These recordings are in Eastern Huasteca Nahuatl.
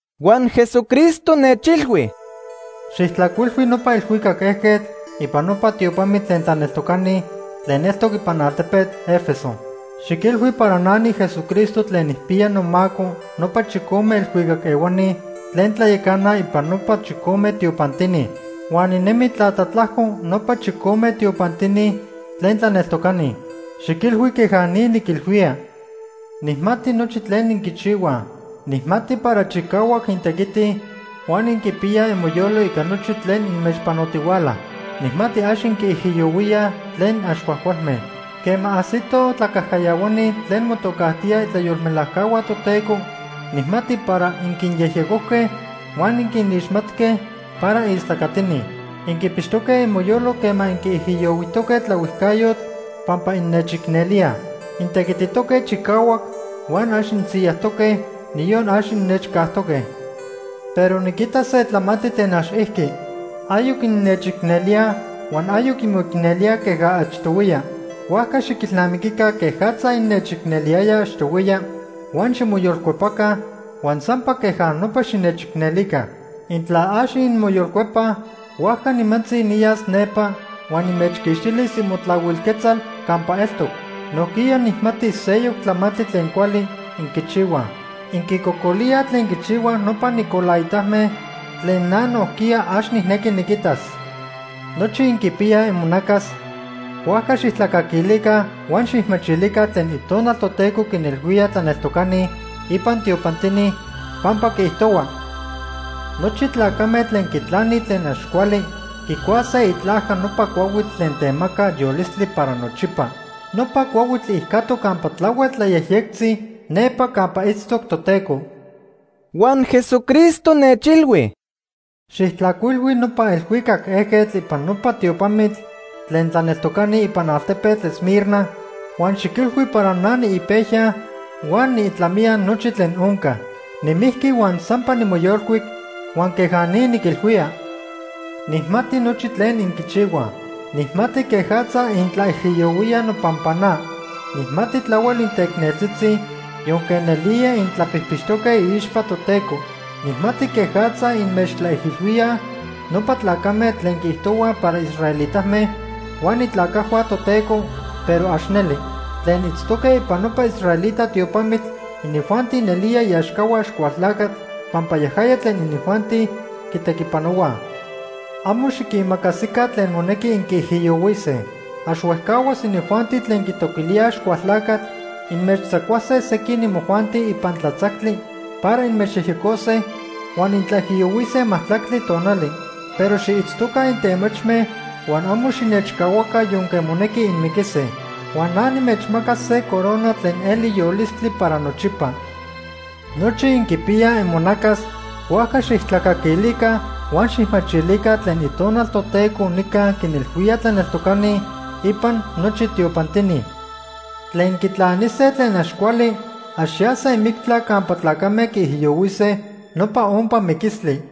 Huan Jesucristo nechilhui: “Xijtlajcuilhui nopa elhuicac ejquetl ipan nopa tiopamitl tlen tlaneltocani tlen eltoc ipan altepetl Éfeso. Xiquilhui para na niJesucristo tlen nijpiya nomaco nopa chicome elhuicac ehuani tlen tlayacanaj ipan nopa chicome tiopantini. Huan ninemi tlatlatlajco nopa chicome tiopantini tlen tlaneltocani. Xiquilhui queja ni niquilhuía: “Nijmati nochi tlen inquichihuaj. Nijmati para chicahuac intequitij huan inquipiyaj imoyolo ica nochi tlen inmechpanotihuala. Nijmati ax inquinijiyohuíaj tlen ax cuajcualme. Quema ajsitoj tlacajcayahuani tlen motocajtíaj itlayolmelajcahua Toteco, nijmati para inquinyejyecojque huan inquinixmatque para istlacatini. Inquipixtoque imoyolo quema inquiijiyohuijtoque tlaohuijcayotl pampa innechicnelíaj. Intequititoque chicahuac huan ax insiyajtoque, niyon ax innechcajtoque. “Pero niquita se tlamantli tlen ax ijqui. Ayoc innechicnelíaj huan ayoc inmoicnelíaj queja achtohuiya. Huajca xiquilnamiquica quejatza innechicneliyayaj achtohuiya huan ximoyolcuepaca huan sampa queja nopa xinechicnelica. Intla ax inmoyolcuepaj, huajca nimantzi niyas nepa huan nimechquixtilis imotlahuil quetzal campa eltoc. Nojquiya nijmati seyoc tlamantli tlen cuali inquichihuaj. Inquicocolíaj tlen quichihuaj nopa nicolaitame tlen na nojquiya ax nijnequi niquitas. “Nochi inquipiyaj imonacas, huajca xijtlacaquilica huan xijmachilica tlen Itonal Toteco quinilhuía tlaneltocani ipan tiopantini, pampa quiijtohua: Nochi tlacame tlen quitlanij tlen ax cuali quicuase itlajca nopa cuahuitl tlen temaca yolistli para nochipa. Nopa cuahuitl ijcatoc campa tlahuel tlayejyectzi nepa campa itztoc Toteco.” Huan Jesucristo nechilhui: “Xijtlajcuilhui nopa elhuicac ejquetl ipan nopa tiopamitl tlen tlaneltocani ipan altepetl Esmirna huan xiquilhui para na niipejya huan niitlamiya nochi tlen onca. Nimijqui huan sampa nimoyolcuic huan queja ni niquilhuía: “Nijmati nochi tlen inquichihuaj. Nijmati quejatza intlaijiyohuíaj nopampa na. Nijmati tlahuel inteicneltzitzi, yonque nelía intlapijpixtoque iixpa Toteco. Nijmati quejatza inmechtlaijilhuíaj nopa tlacame tlen quiijtohuaj para israelitame huan itlacajhua Toteco, pero ax neli. Tlen itztoque ipan nopa israelita tiopamitl, inijuanti nelía iaxcahua Axcualtlacatl pampa yajaya tlen inijuanti quitequipanohuaj. Amo xiquimacasica tlen monequi inquiijiyohuise. Ax huejcahuas inijuanti tlen quitoquilíaj Axcualtlacatl inmechtzacuase sequin imojuanti ipan tlatzactli para inmechyejyecose, huan intlaijiyohuise majtlactli tonali. Pero xiitztoca intemachme huan amo xinechcahuaca yonque monequi inmiquise. Huan na nimechmacas se corona tlen eli yolistli para nochipa. “Nochi inquipiyaj imonacas, huajca xijtlacaquilica huan xijmachilica tlen Itonal Toteco nica quinilhuía tlaneltocani ipan nochi tiopantini. Tlen quitlanise tlen ax cuali ax yase mictla campa tlacame quiijiyohuise nopa ompa miquistli.”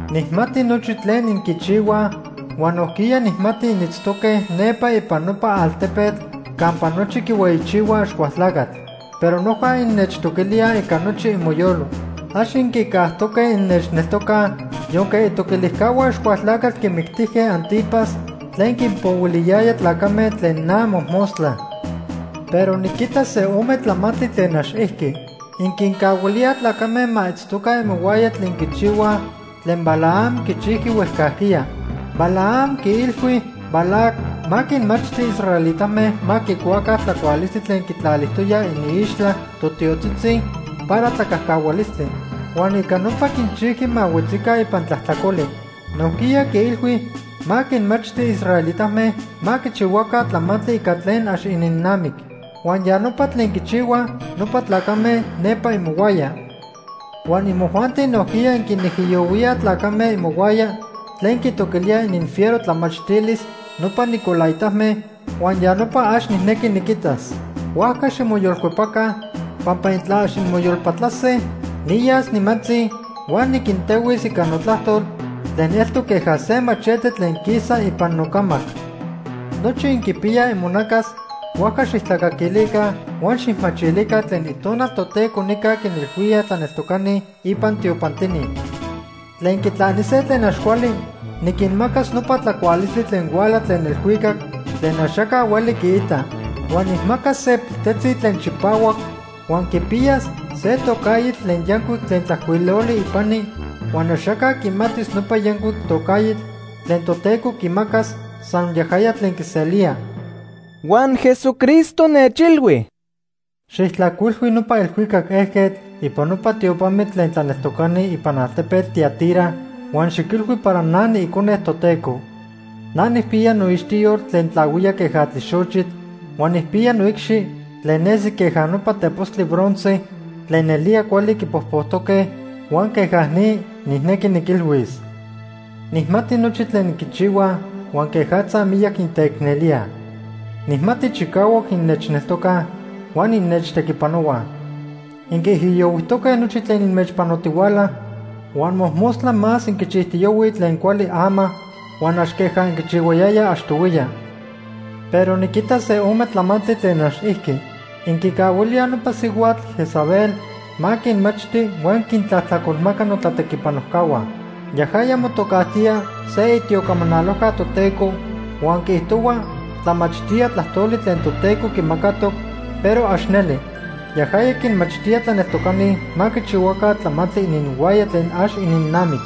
“Nijmati nochi tlen inquichihuaj huan nojquiya nijmati initztoque nepa ipan nopa altepetl campa nochi quihueyichihuaj Axcualtlacatl. Pero noja innechtoquilíaj ica nochi imoyolo. Ax inquicajtoque innechneltocaj yonque itoquilijcahua Axcualtlacatl quimictijque Ántipas tlen quinpohuiliyaya tlacame tlen na mojmostla. “Pero niquita se ome tlamantli tlen ax ijqui. Inquincahuilíaj tlacame ma itztoca imohuaya tlen quichihuaj tlen Balaam quichijqui huejcajquiya. Balaam quiilhui Balac ma quinmachti israelitame ma quicuaca tlacualistli tlen quitlalijtoyaj iniixtla totiotzitzi para tlacajcahualistli. Huan ica nopa quinchijqui ma huetzica ipan tlajtlacoli. Nojquiya quiilhui ma quinmachti israelitame ma quichihuaca tlamantli ica tlen ax ininnamic, huan ya nopa tlen quichihuaj nopa tlacame nepa imohuaya. Huan imojuanti nojquiya inquinijiyohuíaj tlacame imohuaya tlen quitoquilíaj ininfiero tlamachtilis nopa nicolaitame huan ya nopa ax nijnequi niquitas. Huajca ximoyolcuepaca, pampa intla ax inmoyolpatlase, niyas nimantzi huan niquintehuis ica notlajtol tlen eltoc queja se machete tlen quisa ipan nocamac. “Nochi inquipiyaj imonacas, huajca xijtlacaquilica huan xijmachilica tlen Itonal Toteco nica quinilhuía tlaneltocani ipan tiopantini. Tlen quitlanise tlen ax cuali niquinmacas nopa tlacualistli tlen huala tlen elhuicac tlen axaca hueli quiita. Huan nijmacas se piltetzi tlen chipahuac huan quipiyas se tocaitl tlen yancuic tlen tlajcuiloli ipani huan axaca quimatis nopa yancuic tocaitl tlen Toteco quimacas, san yajaya tlen quiselía.” Huan Jesucristo nechilhui: “Xijtlajcuilhui nopa elhuicac ejquetl ipan nopa tiopamitl tlen tlaneltocani ipan altepetl Tiatira huan xiquilhui para na niIcone Toteco. Na nijpiya noixtiyol tlen tlahuía queja tlixochitl huan nijpiya noicxi tlen nesi queja nopa tepostli bronce tlen nelía cuali quipojpojtoque huan queja ni nijnequi niquilhuis: “Nijmati nochi tlen inquichihuaj huan quejatza miyac inteicnelíaj. Nijmati chicahuac innechneltocaj huan innechtequipanohuaj. Inquiijiyohuijtoque nochi tlen inmechpanotihuala, huan mojmostla más inquichijtiyohuij tlen cuali ama huan ax queja inquichihuayayaj achtohuiya. “Pero niquita se ome tlamantli tlen ax ijqui. Inquicahuilíaj nopa sihuatl Jezabel ma quinmachti huan quintlajtlacolmaca notlatequipanojcahua. Yajaya motocajtía se itiocamanalojca Toteco huan quiijtohua tlamachtía tlajtoli tlen Toteco quimacatoc, pero ax neli. Yajaya quinmachtía tlaneltocani ma quichihuaca tlamantli ininhuaya tlen ax ininnamic.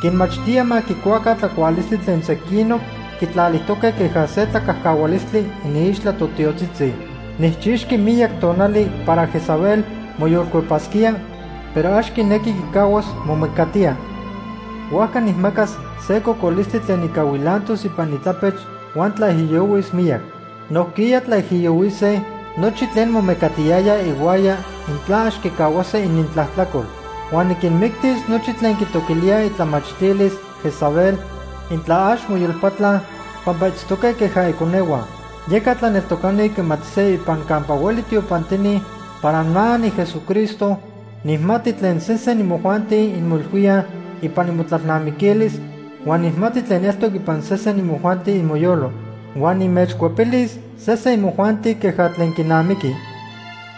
Quinmachtía ma quicuaca tlacualistli tlen sequinoc quitlalijtoque queja se tlacajcahualistli iniixtla totiotzitzi. Nijchixqui miyac tonali para Jezabel moyolcuepasquía, pero ax quinequi quicahuas momecatía. Huajca nijmacas se cocolistli tlen ica huilantos ipan itlapech huan tlaijiyohuis miyac. Nojquiya tlaijiyohuise nochi tlen momecatiyayaj ihuaya intla ax quicahuase inintlajtlacol. Huan niquinmictis nochi tlen quitoquilíaj itlamachtilis Jezabel, intla ax moyolpatlaj, pampa itztoque queja iconehua. Yeca tlaneltocani quimatise ipan campa hueli tiopantini para na, niJesucristo, nijmati tlen sesen imojuanti inmoilhuíaj ipan imotlalnamiquilis huan nijmati tlen eltoc ipan sesen imojuanti imoyolo. Huan nimechcuepilis sesen imojuanti queja tlen quinamiqui.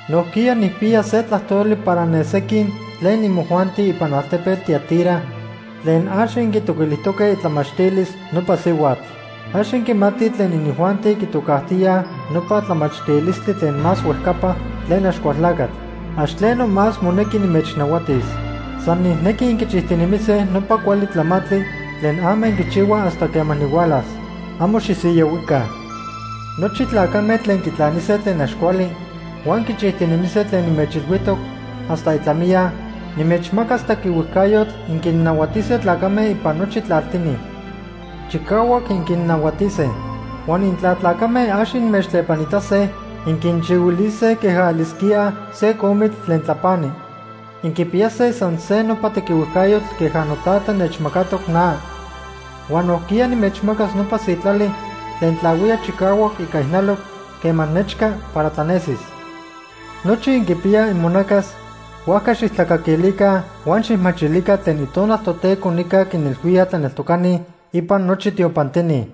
Nojquiya nijpiya se tlajtoli para ne sequin imojuanti ipan altepetl Tiatira tlen ax inquitoquilijtoque itlamachtilis nopa sihuatl. Ax inquimatij tlen inijuanti quitocajtíaj nopa ‘tlamachtilistli tlen más huejcapa’ tlen Axcualtlacatl. Ax tleno más monequi nimechnahuatis. San nijnequi inquichijtinemise nopa cuali tlamantli tlen ama inquichihuaj hasta quema nihualas. Amo xisiyahuica. “Nochi tlacame tlen quitlanise tlen ax cuali huan quichijtinemise tlen nimechilhuijtoc hasta itlamiya, nimechmacas tequihuejcayotl inquinnahuatise tlacame ipan nochi tlaltini. Chicahuac inquinnahuatise. Huan intla tlacame ax inmechtlepanitase, inquinchihuilise queja elisquíaj se comitl tlen tlapani. Inquipiyase san se nopa tequihuejcayotl queja noTata nechmacatoc na. Huan nojquiya nimechmacas nopa sitlali tlen tlahuía chicahuac ica ijnaloc quema nechca para tlanesis. Nochi inquipiyaj imonacas, huajca xijtlacaquilica huan xijmachilica tlen Itonal Toteco nica quinilhuía tlaneltocani ipan nochi tiopantini.”